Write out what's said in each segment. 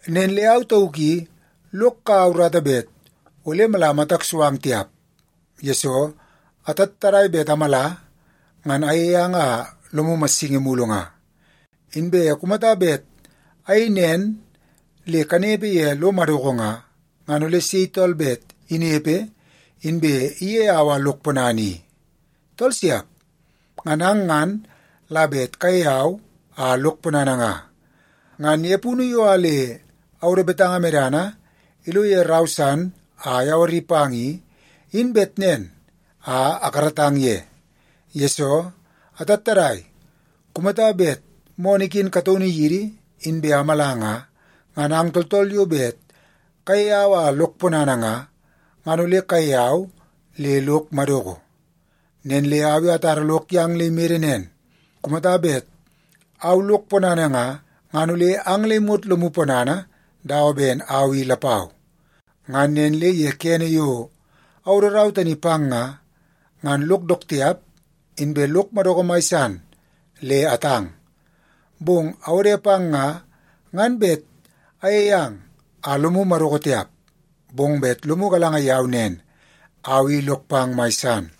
Nen le au tauk i lok kaua urata bet ole mala matak so ang tiap, yesoo atattadai bet amala, ngan ayei ang a lomu massingi mulu nga. Inbe kumata bet ayei nen le kanepe ye lo madoko nga, ngan ole sei tool bet inepe inbe iyei au a lok ponana i? Tool siap! Ngan ang ngan la bet kayei au a lok ponana nga. Ngan ye punu yo a le awodo betanga medana ilo ye rau san a ayawari pang i, in bet nen a akaratang ye. Yesoo, atattadai kumata bet moonoo iken kataunu yidi inbe amala nga, ngan ang tooltool yo bet kayei au a lok ponana nga, ngan ole kayei au le lok madoko. Nen le au i atara lok yang le imede nen, kumata bet au lok ponana nga, ngan ole ang le imot lomu ponana dawa ben au i lapau. Ngan nen le ye kene yo awodo rau tani pang nga, ngan lok dook tiap, inbe lok madoko mai san le atang. Bong awode pang nga, ngan bet ayei ang a lomu madoko tiap, bong bet lomu galanga yau nen, au i lok pang mai san.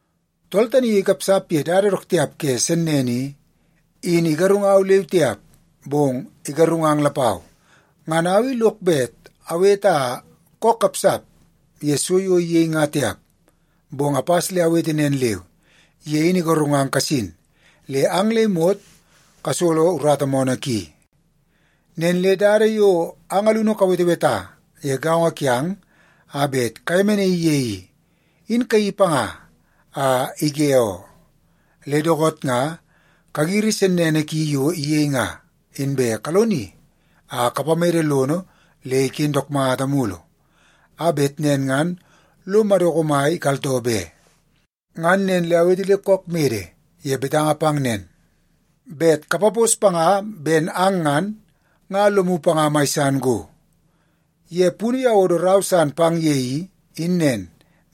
Tool tani yo ikapsap ye dada dook tiap ke sennene i, in igarungau leu tiap, bong igarungang lapau. Ngan au i lok bet awete a kook kapsap ye so yo iyei nga tiap, bong apas le awete nen leu, ye in igarungang kasin le ang le imot kasolo urata moonoo ki. Nen le dada yo ang alunu kaweteweta ye gaongo kiang a bet kayemenaii ye i, in kayeii panga a ige oo. Le dookoot nga kagiri sennene ki yo iyei nga, inbe kaloni a kapamede lono le iken dook mata mulu, a bet nen ngan lo madoko mai ikaltoo be. Ngan nen le awete le kook mede ye betanga pang nen, bet kapapos panga ben ang ngan, nga lomu panga mai san go. Ye punu yo awodo rau san pang ye i, in nen,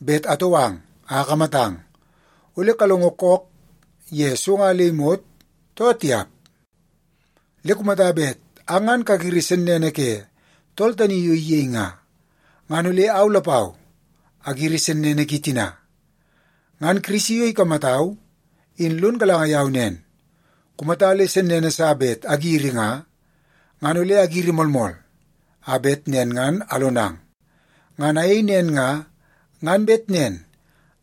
bet atou ang a akamatang, ole kalongo kook ye so nga le imot, too tiap. Le kumata bet ang ngan kagiri sennene ke tool tani yo iyei nga, ngan ole au lapau agiri sennene ki tina. Ngan Kirisi yo ikamatau, in lon galanga yau nen, kumata le sennene sa bet agiri nga, ngan ole agiri moolmool, a bet nen ngan alonang. Ngan ayei nen nga, ngan bet nen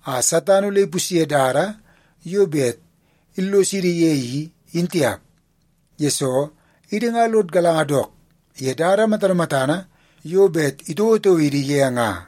a Satan ole ipusye dada yo bet illosidi ye i, in tiap, yesoo idi nga lod galanga dook ye dada matana matana yo bet itouotouo idi ye nga.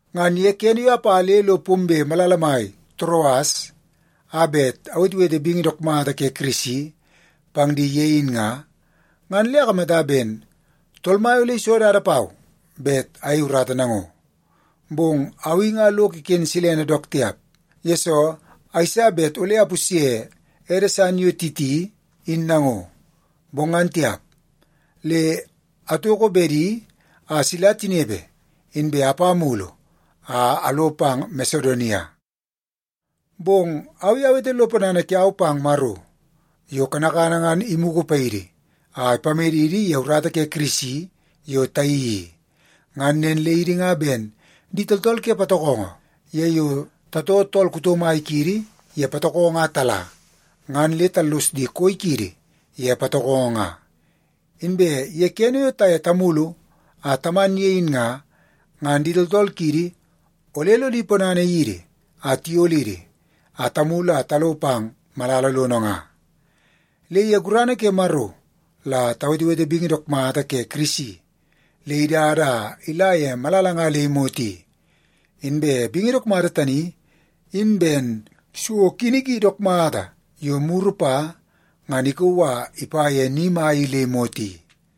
Ngan ye kene yo apa le lo pombe malala mai Toroas a bet awetewete bingi dook mata ke Kirisi pang di ye in nga, ngan le akamata ben Tool Mai ole iso dada pau bet ayei urata nango. Bong au i nga lok iken silene dook tiap, yesoo ayeisa bet ole apusye ede san yo Titi in nango. Bong ngan tiap, le atoko bedi a sila tinepe, inbe apa mulu a alo pang Masedonia. Bong au i awete lo ponana kiau pang Maro yo kanakana ngan imugu paidi a ipamedidi ye urata ke Kirisi yo tayeii i. Ngan nen le idi nga ben di tooltool ke patokongo ye yo tatoo tool kuto mai kiidi ke patokongo a tala, ngan le tallos di koi kiidi ye patokongo nga. Inbe ye kene yo taye tamulu a taman ye in nga, ngan di tooltool kiidi ole lodi ponana yidi a tiyolidi a tamulu a talo pang malala lono nga. Le ye gurana ke Maro la tawetewete bingi dook mata ke Kirisi le idada a ila ye malala nga le imot i. Inbe bingi dook mata tani in ben so kini ki dook mata yo muru pa ngan ikauu a ipa ye ni mai i le imot i.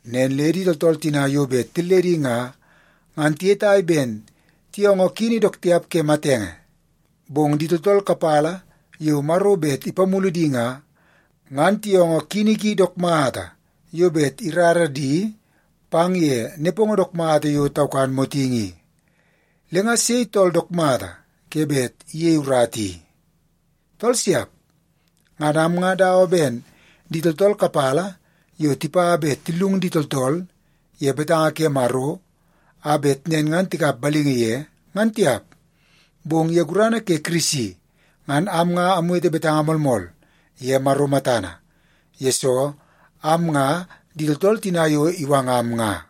Nen le di tooltool tina yo bet tilledi nga, ngan tiyetai ben tiyoongoo kini dook tiap ke matenge. Bong di tooltool kapala yo Maro bet ipamulu di nga, ngan tiyoongoo kini ki dook mata yo bet irara di pang ye nepongo dook mata yo taukan motingi i. Le nga sei tool dook mata ke bet iyei urata i? Tool siap! Ngan am nga dawa ben di tooltool kapala yo tipa bet tillung di tooltool ye betanga ke Maro, a bet nen ngan tikap balingi ye, ngan tiap. Bong ye gurana ke Kirisi ngan am nga awete betanga moolmool ye Maro matana, yesoo am nga di tooltool tina yo iwangam nga.